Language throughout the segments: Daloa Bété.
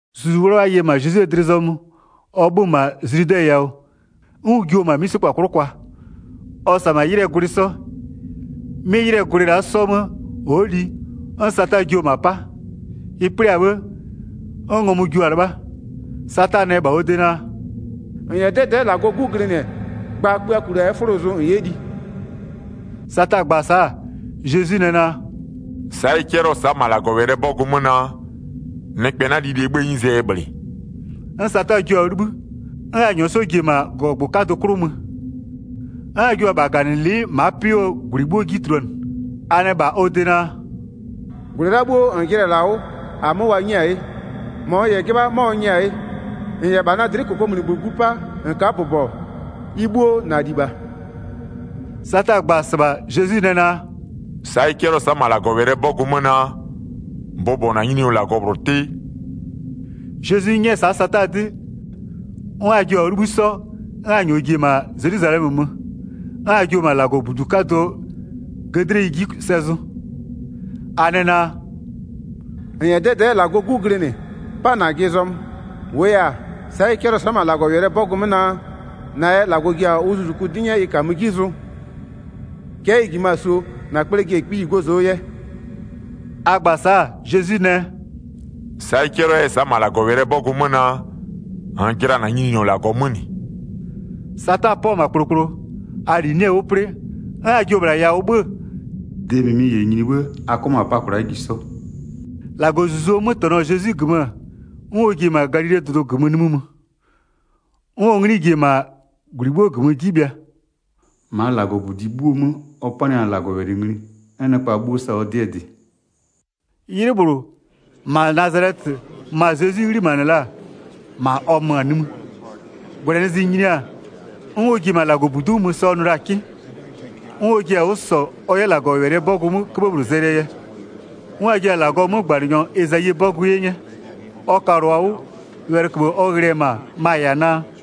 Zuzu 'Wlawla ye-e -ma Zezwie dlɩ zɔmö ɔ 'bhö-ö -ma Zludɛ yawʋ, 'n ʋ jio-o -ma 'mïsekpa 'klʋ kwa. Ɔ -sa-a -ma 'ylɩɛ gwlɩ 'sɔ. 'Mɩ 'ylɩɛ gwlɩ la'a 'sɔ 'mö ɔ'ɔ li, 'n Sata jio-o -ma 'pa. Ɩ 'plɩ-a 'bhë, 'n ngɔmʋ jio-a 'lɩbha. Sata nɛ -bha ɔ de naa: “-N -yɛ 'dɛdɛ'ɛ -Lagɔɔ 'Gu glɩnɩ, gba kpöako -la 'yɛ 'fʋlo zʋ -n 'yɛ li.” Sata gba-a sa'a, Zezwi nɛ naa: “Sa'a ɩ 'cɛlɩɔ-ɔ sa'a -ma -Lagɔwɛlɩɛ 'bɔgʋ 'mö naa: Nɩkpɛ 'na lilie 'bhëë 'nyizee yɛ -bhlɩ.” 'N Sata jio-a 'wʋ 'libhï, 'n a -nyɔɔ ji-e -ma -gɔgɔgbʋ 'kadʋ -bhlʋɔ 'klʋ mö. 'N a jio-o -bha -gaganɩlɩ'ɩ ma'a 'pɩ 'wʋɔ -gwlɩ 'bhuo 'ji tuluanɩ. A nɛ -bha ɔ de naa: “-Gwlɩ la'a bhuo -n jɩnɩ-ɛ -la 'wʋ, -amö wa 'nyɩ-a 'ye, -mɔ n -yɛ 'jɩbha 'mɔ n nyɩ-a 'ye. 7-N -yɛ -bha na dlɩ'ɩ -kokomunigbö glu 'pa -n ka'a bʋbɔ-ɔ, ɩ 'bhuo -na -li -bha.” Sata gba-a -sɩbha Zezwi nɛ naa: “Sa'a ɩ 'cɛlɩɔ-ɔ sa'a -ma -Lagɔwɛlɩɛ 'bɔgʋ 'mö naa: Bʋbɔ -na Nyininyɔ -Lagɔ -bhlʋ 'tɩ.” Zezwi 'nyɛ-ɛ sa'a Sata 'dɩ, 'n a jio-a 'wʋ 'libhï 'sɔ, 'n a -nyɔɔ ji-e -ma Zelwizalɛmö mö, 'n a jio-o -ma -Lagɔbudu 'kadʋɔ 'gëdleyi 'ji sɛ zʋ. A nɛ naa: “-N -yɛ 'dɛdɛ'ɛ -Lagɔɔ 'gu glɩnɩ-ɛ, 'pa -najɩ zɔmö. 10-Wʋʋ 'yɛ-a, sa'a ɩ 'cɛlɩɔ-ɔ sa'a -ma -Lagɔwɛlɩɛ 'bɔgʋ 'mö naa: -Na yɛ -Lagɔ ji-a ʋ zuzuku 'dɩ 'nyɛɛ ɩ -kamö 'ji zʋ. Cɛ'ɛ ɩ -jimö-a -suo na kple ji-e kpiyi gozoo yɛ.” A gba-a sa'a Zezwi nɛ: “Sa'a ɩ 'cɛlɩɔ-ɔ 'yɛ-ɛ sa'a -nɩ -ma -Lagɔwɛlɩɛ 'bɔgʋ 'mö naa, -nn jɩla -na Nyininyɔ -Lagɔ 'mö -nɩ.” Sata 'pɔ-ɔ -ma kplokplo, a -li 'nɩ-ɛ 'wʋ 'plɩ, 'n a jio-o -bhla yawʋ 'bhö-ö, de -mɩmɩ -yɛ nyini 'bhë a 'kɔ -ma -pa kwla'a ji 'sɔ. Zezwi yɛ ɔ -Lagɔlibho tɛ-ɛ 14-Lagɔɔ Zuzuo 'mötɛnɔ-ɔ Zezwi -gömö 'n ɔ ji-e -ma Galilee dʋdʋ -gömö nimï mö. 'N ɔ 'nglɩ ji-e -maa -gwlɩ 'bhuo -gömö 'ji bhɩa. 15-Maa -Lagɔbudi 'bhuoo 'mö ɔ panɩ-a -Lagɔwɛlɩ ngli, 'n nɩkpa 'bhuo sa-a ɔ 'dɩɛ dɩ. 'Ylɩ -bhlʋ, -ma Nazalɛtɩ ma Zezwi 'ghlimanɩ la-a, -ma ɔ mö-a nimï. -Gwlɛnɩzlɩ nyini-a, 'n ɔ ji-e -ma -Lagɔbudu'u mö sa ɔ nʋ la-a 'kɩ. 'N ɔ ji-a 'wʋ -sɔ ɔ 'yɛ -Lagɔwɛlɩɛ 'bɔgʋ 'möö 'köbhë -bhlʋ zɛlɩɛ yɛ. 'N wa jio-a -Lagɔɔ 'mögbanɩnyɔ Ezayie -Lagɔbɔgʋ 'ye 'nyɛ. Ɔ kalʋ-a 'wʋ, wɛlɩköbhë ɔ ghlɩ-ɛ -ma, ma-a -yɛ-a naa: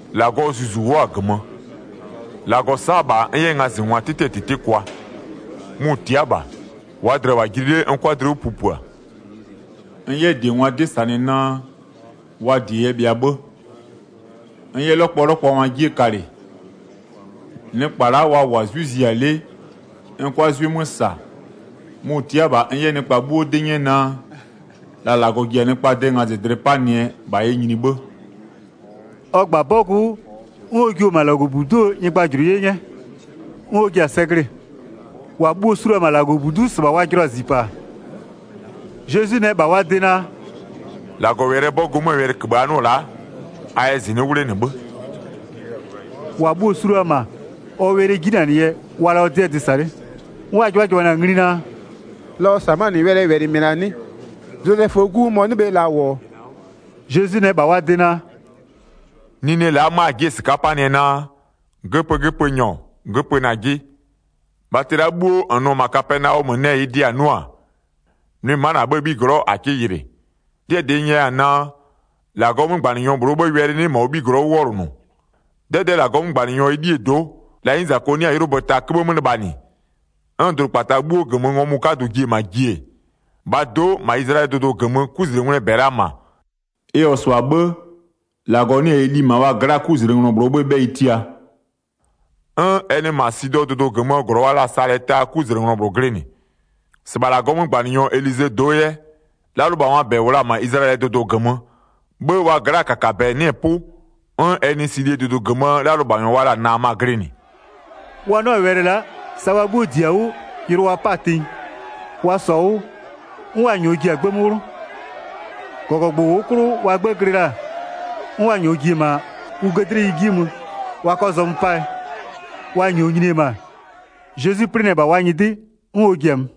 “-Lagɔɔ Zuzu wʋ'ʋ-a -gömö, -Lagɔ sa'a-a -bha n 'yɛ ngazɩngwa 'tɩtɩɛ -tɩtɩ kwa. Mʋ-ʋ tia'a -bha, -waa dlɩa -wʋ-a jili 'le n 'kʋa dlɩ 'wʋ pupua. N 'yɛ -diengwa 'dɩ -sanɩ naa, wa -die yɛ bhɩa 'bhë. N 'yɛ 'lɔkpɔlɔkpɔngwaa 'jie kalɩ. Nɩkpa la'a wa -wʋ-a 'zwɩ zia 'le n 'kʋa 'zwɩ 'mö -sa. Mʋ-ʋ tia'a-a -bha n 'yɛ nɩkpa 'bhuo 'dɩ 'nyɛ naa: La -Lagɔ ji-a nɩkpaa de ngazɩdlɩ 'panɩɛ -bha yɛ nyini 'bhë.” Ɔ -gba-a 'bɔgʋ 'wʋ, 'n ɔ jiʋ-o -ma -Lagɔbudu'uo nyɩgbajʋlʋ 'ye 'nyɛ, 'n ɔ ji-a sɛ glɩ-ɩ. -Wa bhuo-o su la-a -ma -Lagɔbudu'u -sɩbha wa jɩlɔ-a -zipaa. Zezwi nɛ -bha wa de naa: “-Lagɔwɛlɩɛ 'bɔgʋ 'möö wɛlɩköbhë a 'nʋ-ɔ la'a, a yɛ -zɩnɩ'ɩ 'wʋ 'wlenɩ 'bhë.” 22-Wa bhuo-o su la-a -ma, ɔ wɛlɩɛ 'jinanɩ yɛ wa-a la'a ɔ 'dɩɛ dɩ -sa 'le. 'N wa 'jɩbhajɩbhanɩ-a ngli naa: “La ɔ -sa-a 'mö-a -nɩ wɛlɩɛ -wɛlɩ -mɩ -la -sa 'nɩ? Zozɛföö 'gu mɔ-ɔ 'nɩ bhe -la -wʋ-ɔ?” Zezwi nɛ -bha wa de naa: “Nine la'a 'ma a ji'i-e -sɩka'a 'panɩɛ naa, göpögöpönyɔ göpö -najɩ, bhatɩ la'a 'bhuo -n nʋ-ɔ -ma Kapɛnaɔmö nɛ -ɩɩ dɩ -a 'nʋ-a, nʋɩ ma'a -na 'bhëë 'bhiglɔ'ɔ -a 'kɩ yɩlɩ. 'Dɩɛ -dɩ n nyɛya-a naa, -Lagɔɔ 'mögbanɩnyɔ -bhlʋɔ 'bhëë wɛlɩ 'nɩ -ma ɔ 'bhiglɔ'ɔ 'wʋ 'wɔlʋnʋ. 'Dɛdɛ'ɛ -Lagɔɔ 'mögbanɩnyɔ Elie do'o, la 'nyizako 'nɩ-a 'ylʋbö ta 'köbhë 'mö lɩbhanɩ, 'n dʋdʋkpata 'bhuoo -gömö ngɔmʋ 'kadʋ ji-e -ma ji-e, -bhaa do'o -ma Izlayɛlɩɛ dʋdʋ -gömö 'kuzlengwlɩɛ -bɛ-ɛ la -ma. Ɩ -wʋ-ɔ -sɩbha 'bhë, -Lagɔ 'nɩ-ɛ Eli -ma wa gla'aa 'kuzlenglɔ -bhlʋɔ 'bhëë 'bhɛyɩ tia, 'n ɛ nɩ -ma Sidɔɔ dʋdʋ -gömöö -glɔ wa la-a Salɛtaa 'kuzlenglɔ -bhlʋ glɩnɩ. 27-Sɩbha -Lagɔɔ 'mögbanɩnyɔ Elizee do'o 'yɛ, 'lalʋlɩbhangwaa -bɛ -wʋ la-a -ma Izlayɛlɩɛ dʋdʋ -gömö, 'bhë wa gla'aa -kakabɛ 'nɩ-ɛ 'pʋ, 'n ɛ nɩ Silie dʋdʋ -gömöö 'lalʋlɩbhanyɔ wa la-a Naama glɩnɩ.” Wa 'nʋ-a wɛlɩ la'a sa wa 'bhuo -di-a 'wʋ yʋlʋ wa 'pa-a tenyi. Wa -sɔ-a 'wʋ, 'n wa -nyɔɔ ji-a gbë 'mö 'wlʋ. -Gɔgɔgbʋ -ʋʋ 'klʋ wa 'gbë glɩ la-a, 'n wa -nyɔɔ ji-e -ma ʋ 'gëdleyi 'ji mö wa 'kɔ zɔmö 'paa yɛ. Wa -nyɔɔ nyini-e -ma, Zezwi 'plɩnɩ-ɛ -bha wa nyɩdɩ 'n ɔ ji-a mö.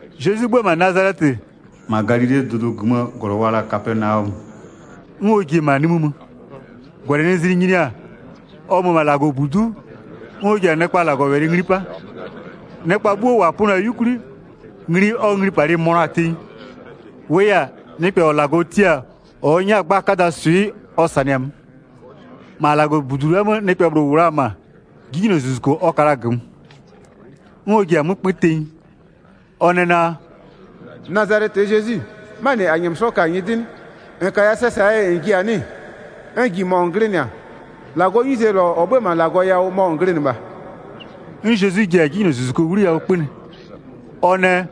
Zezwi 'bhö-ö -ma Nazalɛtɩ, -ma Galilee dʋdʋ -gömöö -glɔ wa la-a Kapɛnaɔmö, 'n ɔ ji-e -ma nimï mö. -Gwlɛnɩzlɩ nyini-a, ɔ mö-ö -ma -Lagɔbudu'u 'n ɔ ji-a nɩkpa -Lagɔwɛlɩ ngli 'pa. Nɩkpa bhuo -wa pönɩɔ-a 'yukwli, ngli ɔ nglipalɩ mönʋa-a tenyi, -wʋʋ yɛ-a, nɩkpɛ -ɔ -Lagɔ tia-a -ɔ ʋ 'nyɛ-a gba 'kadaa swɩ ɔ -sanɩ-a 'mö. 33-Ma -Lagɔbudu la'aa 'mö nɩkpɛ -bhlʋ -wʋ-ɔ -ma, 'jinylozuzuko ɔ ka la-a -gömö. 'N ɔ ji-a 'mö 'kpö tenyi. Ɔ nɛ naa: “Nazalɛtɩɛ Zezwi, 'manɩ -a -nyɛmö ka-a nyɩdɩ 'nɩ? -N -kaya sɛ -saa yɛ -n ji-a 'nɩ-ɩ? N -ji -mɔ -n glɩnɩ-a. -Lagɔɔ 'nyize -lɔ -ɔ 'bhö-ö -ma -Lagɔ yawʋ mɔ -n glɩnɩ -bha!” 'N Zezwi ji-a 'jinylozuzuko 'wliyawʋ 'kpönɩ. Ɔ nɛ: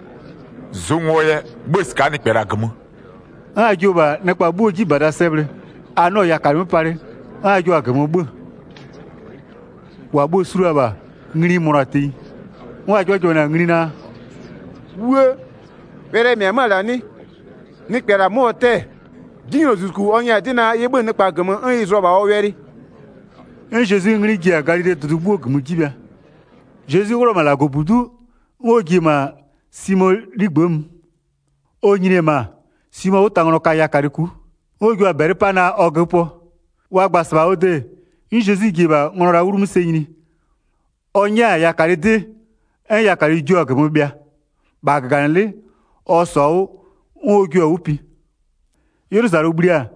“Zʋ ngo yɛ, 'bhö-ö -sɩka'a nɩkpɛ -la -gömö!” 'N a jio-o -bha nɩkpa 'bhuoo 'jibada sɛ bhlɩ, a 'nɩɔ-ɔ yakalɩ 'mö palɩ 'n a jio-a -gömö 'bhö-ö. 36-Wa bhuo-o su la-a -bha ngli-i mönʋa-a tenyi. 'N wa 'jɩbhajɩbhanɩ-a ngli naa: “'Wuë, wɛlɩɛ -mɩ-ɛ 'mö-ö -la 'nɩ? Nɩkpɛ -la 'mö ɔ 'tɛ-ɛ, 'jinylozuzuku ɔ nyɛ-a 'dɩ naa ɩ 'bhö-ö nɩkpa -gömö, 'n ɩ zʋ-ɔ -bha ɔ wɛlɩ.” 'N Zezwie 'nglɩ ji-a Galilee dʋdʋ 'bhuo -gömö 'ji bhɩa. Zezwi 'wlʋ-ɔ -ma -Lagɔbudu'u, 'n ɔ ji-e -ma Simoo 'ligbë'ë mö. Ɔ nyini-e -ma, Simoo 'wʋtanglɔ ka yakalɩ ku'u. 'N wa jio-a -bɛlɩ 'pa naa ɔ göpöɔ. Wa gba-a -sɩbha ɔ de, 'n Zezwi ji-e -bha nglɔ la'a 'wlumö sɛ nyini, ɔ 'nyɛ-a yakalɩ 'dɩ, 'n yakalɩ jio-a -gömö bhɩa. -Bha -gaganɩlɩ'ɩ ɔ -sɔ-a 'wʋ, 'n ɔ jua-a 'wʋ pi. 'Ylʋzalʋ bhli-a,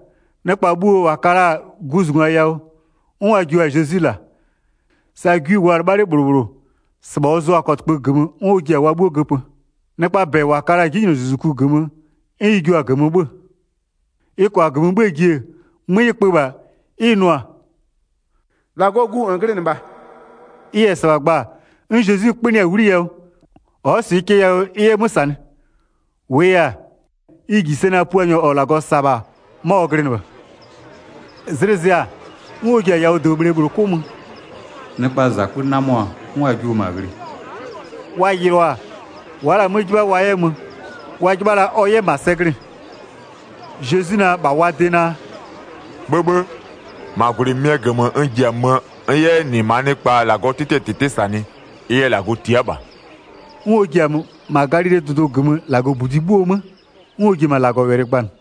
nɩkpa bhuo -wa ka la-a guzungwa yawʋ, 'n wa jua-a Zezwi -la. -Sa gwi -wʋʋa-a 'lɩbha 'le -bhlʋ -bhlʋ, -sɩbha ɔ zʋa-a kɔtɩkpö -gömö 'n ɔ ji-a wa 'bhuo -göpö. Nɩkpaa -bɛ -wa ka la-a 'jinylozuzuku -gömö 'n ɩ jua-a -gömö 'bhö-ö. Ɩ -kʋa -gömö 'bhö-öö ji-e, 'mö ɩ kpö -bha 'n ɩ nʋ-a: “-Lagɔɔ Gu -n glɩnɩ -bha!” Ɩ -yɛ -sɩbha gba 'n Zezwi 'kpönɩɩ-a 'wliyawʋ, ɔ'ɔ -sɩɩ cɛ yawʋ ɩ 'yɛ 'mö -sanɩ. -Wʋʋ yɛ-a, ɩ -ji sɛ naa Puanyɔ -ɔ -Lagɔ -sa-a -bha 'mɔ ɔ glɩnɩ -bha. Zlɩ zɩ-a, 'n ɔ ji-a yawʋdobhle -bhlʋ 'klʋ mö. Nɩkpaa -zakpö 'namɔ-a, 'n wa jio-o -ma ghlɩ. Wa yɩlɩɔ-a, wa'a la-a 'mö 'jɩbha ɔ 'yɛ mö, wa 'jɩbha la ɔ 'yɛ -ma sɛ glɩ-ɩ. Zezwi nɛ -bha wa de naa: “'Bhëbhë, -ma -gwlɩ -mɩmɩɛ -gömö n ji-a möö n 'yɛ 'yɛ -nɩ -maa nɩkpa -Lagɔɔ 'tɩtɩɛ -tɩtɩ -sanɩ, ɩ yɛ -Lagɔ tia'a -bha.” 'N ɔ ji-a mö, -ma Galilee dʋdʋ -gömöö -Lagɔbudi 'bhuo 'mö, 'n ɔ ji-e -ma -Lagɔwɛlɩ gbanɩ.